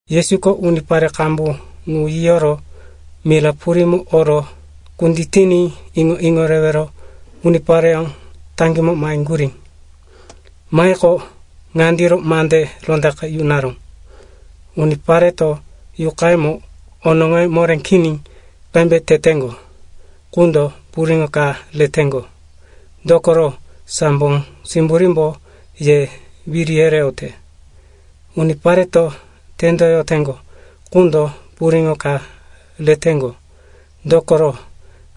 Yesuko unipare qambu ŋu yiyoro mira purímo oro kunditiní iŋo-iŋo rewero unipareyó taŋgímo maheŋgurí. Mahiqo, ŋandiro mande rondaqe yunaró, “Unipareto yuqayemo onoŋoye moré kini qembe teteŋgo qundo puriŋo ka reteŋgo, dokoro, sambo simburímbo ye wiri yereyote. Unipareto tendoyoteŋgo qundo puriŋo ka reteŋgo, dokoro,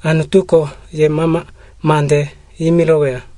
Anutuko yemama mande yimiroweya.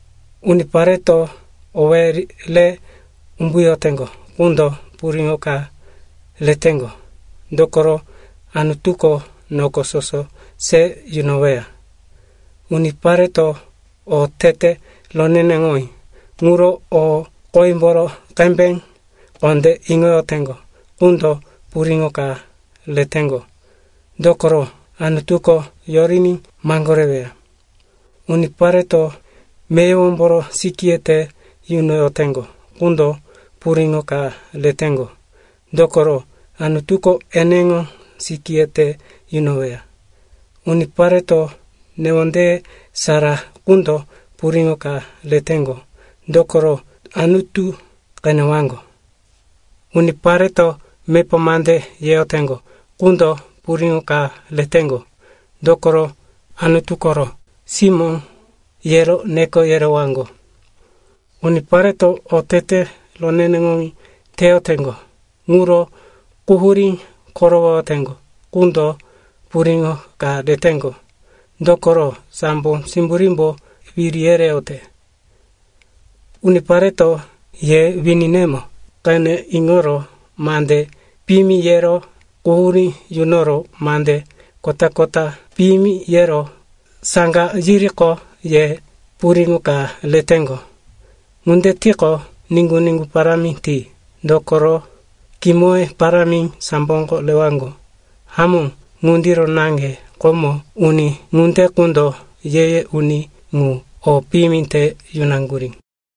Unipareto owéye re umbuyoteŋgo qundo puriŋo ka reteŋgo, dokoro, Anutuko noko soso se yunoweya. Unipareto otete roneneŋowí ŋuro o qoyemboro qembe kondé iŋoyoteŋgo qundo puriŋo ka reteŋgo, dokoro, Anutuko yoriní maŋgoreweya. Unipareto meyowomboro sikíye te yunoyoteŋgo qundo puriŋo ka reteŋgo, dokoro, Anutuko eneŋo sikíye te yunoweya. Unipareto newondeye sara qundo puriŋo ka reteŋgo, dokoro Anutu qenewaŋgo. Unipareto mepa mande yeyoteŋgo qundo puriŋo ka reteŋgo, dokoro Anutu koro simó, yero neko yerewaŋgo. Unipareto otete roneneŋowí teyoteŋgo ŋuro quhurí korowoyoteŋgo qundo puriŋo ka reteŋgo, dokoro, sambo simburímbo wiri yereyote. “Unipareto ye wininemo qene iŋoro mande piyimi yero quhurí yunoro mande kota-kota piyimi yero saŋga yiriqo, ye puriŋo ka reteŋgo. Ŋunde tiqo, niŋgu-niŋgu parámi ti, dokoro kimoye parámi samboko rewaŋgo. Hamó, ŋundiro naŋge komo uni ŋunde qundo ye-ye uni ŋu o piyimi te yunaŋgurí.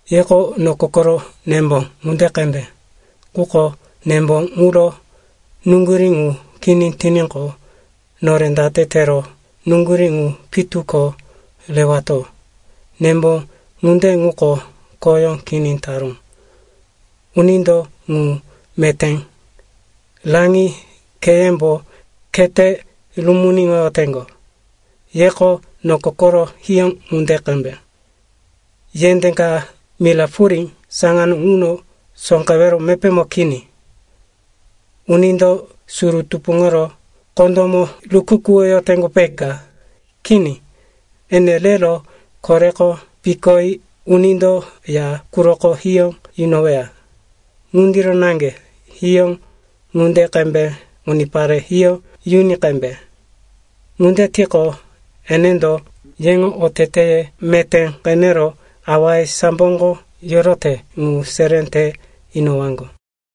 “Yeko noko koro nembo ŋunde qembe. Quko nembo ŋuro nuŋgurí ŋu kini tiníqo, nore date tero nuŋgurí ŋu pitu ko rewato? Nembo ŋunde ŋuko khoyó kini taró. Unindo ŋu meté raŋi kheyembo khete rumuniŋoyoteŋgo. “Yeko noko koro hiyó ŋunde qembe. Yendé ka mira purí saŋano ŋuno sóqewero mepémo kini. Unindo suru tupuŋoro kondómo rukukuwoyoteŋgo, peka? Kini. Ene rero koreko pikoyi unindo ya quroko hiyó yunoweya. Ŋundiro naŋge hiyó ŋunde qembe unipare hiyó yuni qembe. Ŋunde tiqo, enendo yeŋo oteteye meté qenero awaye samboko yorote ŋu seré te inowaŋgo.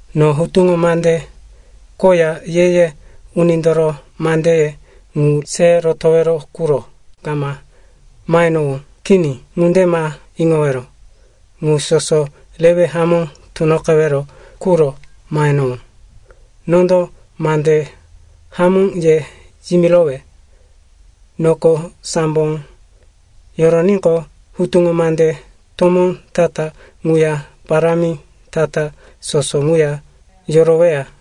“No Hutuŋo Mande koya Ye-ye Unindoro mandeye ŋu se rotowero quro kama mahenowó. Kini. Ŋunde ma iŋowero. Ŋu soso rewe hamó tunoqewero quro mahenowó. Nondo mande hamó ye yimirowe, noko sambo yoroníqo, hutuŋo mande tomó ta-ta ŋuya parámi ta-ta soso ŋuya yoroweya.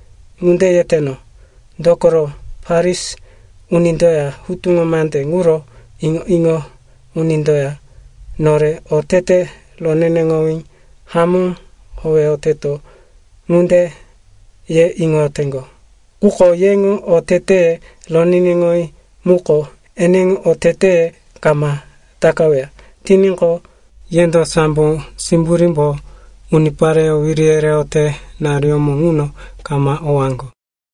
Ŋunde yeteno, dokoro Farisi unindoya hutuŋo mande ŋuro iŋo-iŋo unindoya, nore otete roneneŋowí hamó howeyoteto, ŋunde ye iŋoyoteŋgo. Quko yeŋo oteteye roneneŋowí muko eneŋo oteteye kama takaweya tiníqo, yendo sambo simburímbo unipareyó wiri yereyote naruyómo ŋuno kama owaŋgo.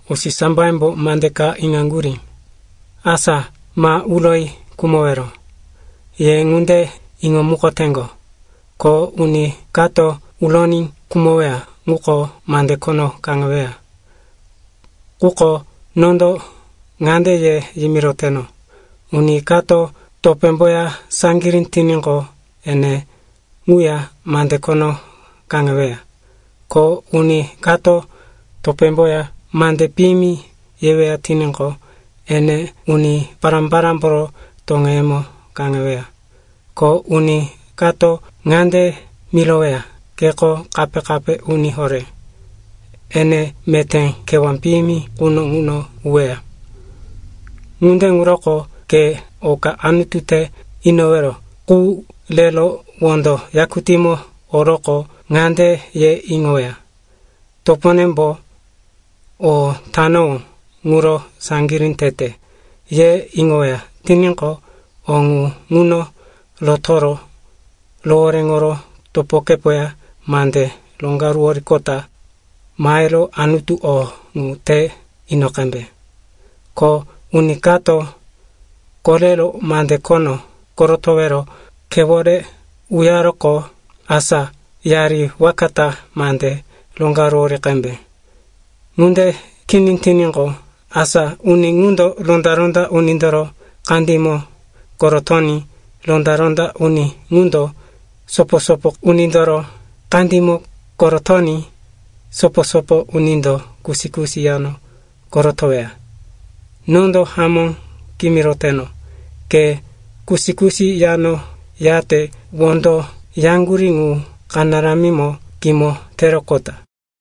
“Usisambayembo mande ka iŋaŋgurí, asa ‘ma uroyi khumowero.’ Ye ŋunde iŋomukoteŋgo, ko uni kato uroní khumoweya ŋuko mande khono kaŋeweya. Quko nondo ŋande ye yimiroteno, uni kato topémboya saŋgirí tiníqo, ene ŋuya mande khono kaŋeweya. Ko uni kato topémboya mande piyimi yeweya tiníqo, ene uni pará-parámboro toŋeyemo kaŋeweya. Ko uni kato ŋande miroweya, ‘Keko kape-kape uni horé,’ ene meté kewá piyimi quno ŋuno uweya. “Ŋunde ŋuroko ke oka Anutu te inowero qu rero wondo yakutímo oroqo, ŋande ye iŋoweya, toponembo o tanowó ŋuro saŋgirí tete, ye iŋoweya tiníqo, o ŋu ŋuno rotoro rohoréŋoro topokepoya mande roŋgaruworoqota mahero Anutu o ŋu te ino qembe. “Ko uni kato korero mande khono korotowero khewore uyaroqo, asa yari waka ta mande roŋgaruwori qembe. Ŋunde kini tiníqo, asa uni ŋundo ronda-ronda unindoro kandímo korotoní ronda-ronda uni ŋundo sopo-sopo unindoro kandímo korotoní sopo-sopo unindo kusi-kusi yano korotoweya. Nondo hamó kimiroteno, ke kusi-kusi yano yate wondo yaŋgurí ŋu kanaramimo kimo teroqota.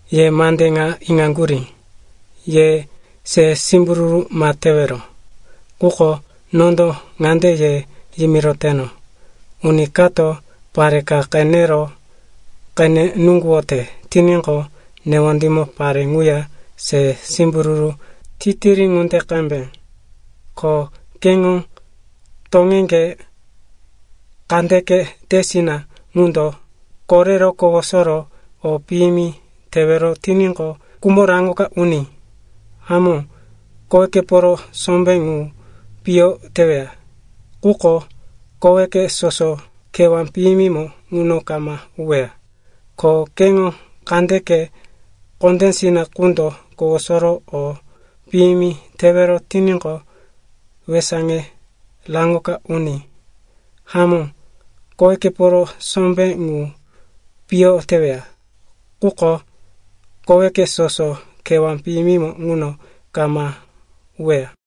“Ye mande ŋa iŋaŋgurí, ‘Ye se simbururu ma tewero.’ Quko nondo ŋande ye yimiroteno, uni kato pare ka qenero qene nuŋguwote tiníqo, newondímo pare ŋuya se simbururu titiri ŋunde qembe. Ko keŋo toŋeŋge kandeke tesina ŋundo korero kowosoro o piyimi tewero tiníqo, kumo raŋoka uní. Hamó, kowekeporo sombé ŋu piyo teweya. Quko koweke soso kewá piyimimo ŋuno kama uweya. Ko keŋo kandeke kondésina ŋundo kowosoro o piyimi tewero tiníqo, wesaŋe raŋoka uní. Hamó kowekeporo sombé ŋu piyo teweya. Quko koweke soso kewá piyimimo ŋuno kama uweya.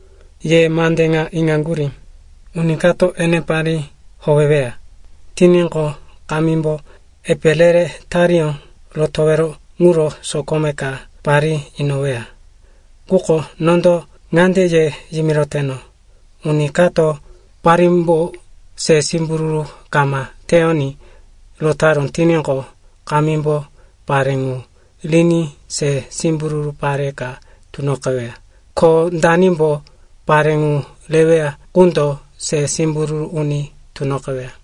“Ye mande ŋa iŋaŋgurí, ‘Uni kato ene parí howeweya tiníqo, kamímbo epe re-re tariyó rotowero ŋuro sokome ka parí inoweya.’ Quko nondo ŋande ye yimiroteno, uni kato parímbo se simbururu kama teyoní rotaró tiníqo, kamímbo pare ŋu riní se simbururu pare ka tunoqeweya. Ko danimbo pare ŋu reweya qundo se simbururu uni tunoqeweya.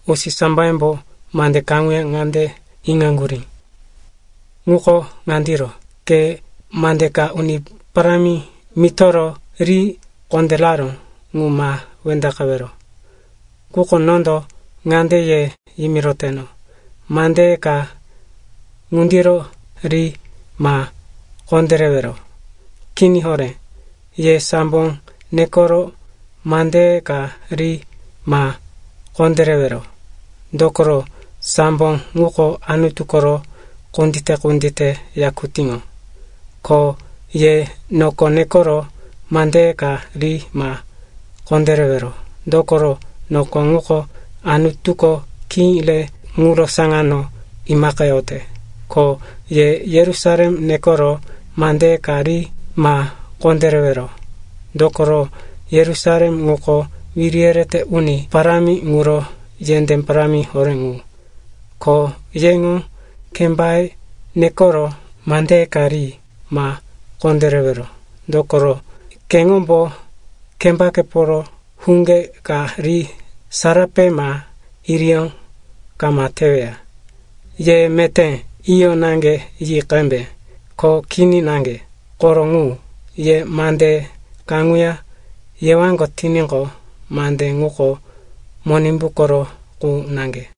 “Usisambeyembo mande kaŋuya ŋande iŋaŋgurí, ŋuko ŋandiro, ‘Ke mande ka Uni Parámi mitoro ri kondéraró ŋu ma wendaqewero.’ Quko nondo ŋande ye yimiroteno, mandeye ka ŋundiro ri ma kondérewero. Kini horé. Ye sambo nekoro mandeye ka ri ma kondérewero, dokoro, sambo ŋuko Anutu koro kundite-kundite yakutíŋo. Ko ye noko nekoro mandeye ka ri ma kondérewero, dokoro, noko ŋuko Anutuko khí re ŋuro saŋano imaqeyote. Ko ye Yerusalem nekoro mandeye ka ri ma kondérewero, dokoro, Yerusalem ŋuko wiri yerete uni parámi ŋuro yendé parámi horé ŋu. Ko yeŋo kembaye nekoro mandeye ka ri ma kondérewero, dokoro, keŋombo kembakeporo huŋge ka ri sarape ma iriyó kama teweya. Ye meté ‘Iyo’ naŋge yi qembe, ko ‘Kini’ naŋge. Koro ŋu. Ye mande kaŋuya yewaŋgo tiníqo, mande ŋuko Monimbu koro qu naŋge.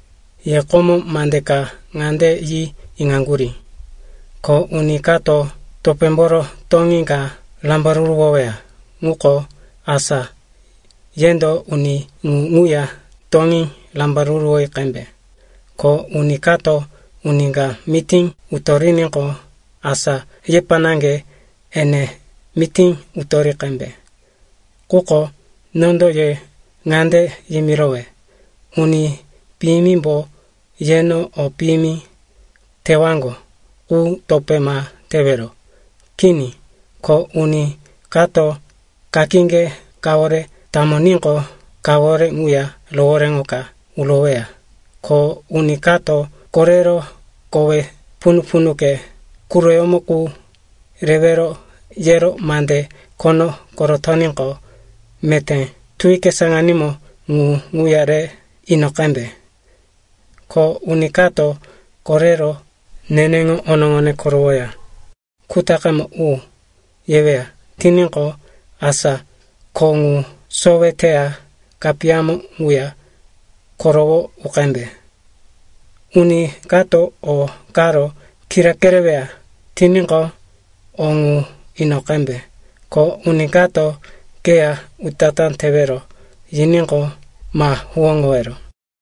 “Ye komo mande ka ŋande yi iŋaŋgurí, ‘Ko uni kato topémboro toŋí ka rambaruruwoweya ŋuko, asa yendo uni ŋu ŋuya toŋí rambaruruwoyi qembe. Ko uni kato uni ka mití utoriníqo, asa yepa naŋge ene mití utori qembe.’ Quko nondo ye ŋande yimirowe, uni piyimimbo yeno o piyimi tewaŋgo ŋu topé ma tewero. Kini. Ko uni kato kakíŋge kawore tamoníqo, kawore ŋuya rohoréŋoka uroweya. Ko uni kato korero kowe punu-punuke quroyómo qu rewero yero mande khono korotoníqo, meté tuwike saŋanímo ŋu ŋuya re ino qembe. Ko uni kato korero, neneŋo onoŋone korowoya kutaqemo u, yeweya tiníqo, asa kho ŋu sowe teya kapiyamo ŋuya korowo u qembe. Uni kato o karo kira kereweya tiníqo, o ŋu ino qembe, ko uni kato keya utatá tewero yiníqo, ma huwóŋowero.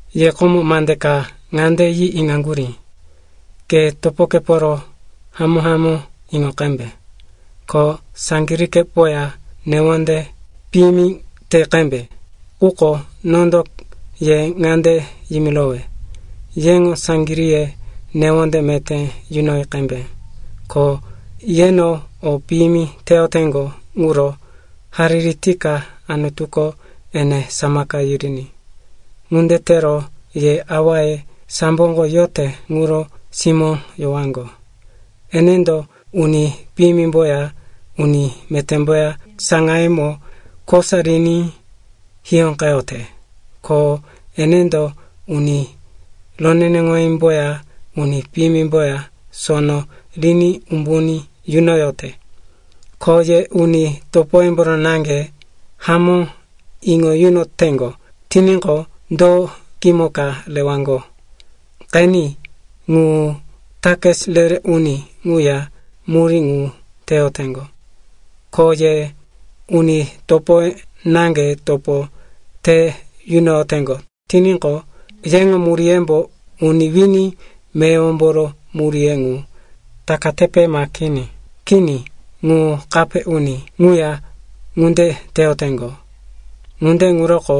“Ye komo mande ka ŋande yi iŋaŋgurí, ‘Ke topokeporo hamó-hamó iŋo qembe, ko saŋgiríŋgepoya newonde piyimi te qembe.’ Quko nondo ye ŋande yimirowe, yeŋo saŋgiríye newonde meté yunoyi qembe, ko yeno o piyimi teyoteŋgo ŋuro hariri tika Anutuko ene samaka yiriní. Ŋunde tero ye awaye samboko yote ŋuro simó yowaŋgo. Enendo uni piyimimboya uni metémboya saŋayemo kosa riní hiyóqeyote. Ko enendo uni roneneŋowímboya uni piyimimboya sono riní umbuní yunoyote. Ko ye uni topoyemboro naŋge hamó iŋo yunoteŋgo tiníqo, do kimo ka rewaŋgo? Qeni, ŋu takis re-re uni ŋuya murí ŋu teyoteŋgo. Ko ye uni topoye naŋge topo te yunoyoteŋgo tiníqo, yeŋo muríyembo uni wini meyowomboro muríye ŋu takatepe ma kini? Kini. Ŋu kape uni ŋuya ŋunde teyoteŋgo. Ŋunde ŋuroko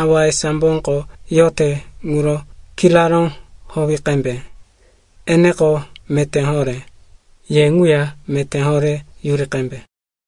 awaye samboko yote ŋuro kiraró howi qembe. Eneko meté horé; ye ŋuya meté horé yuri qembe.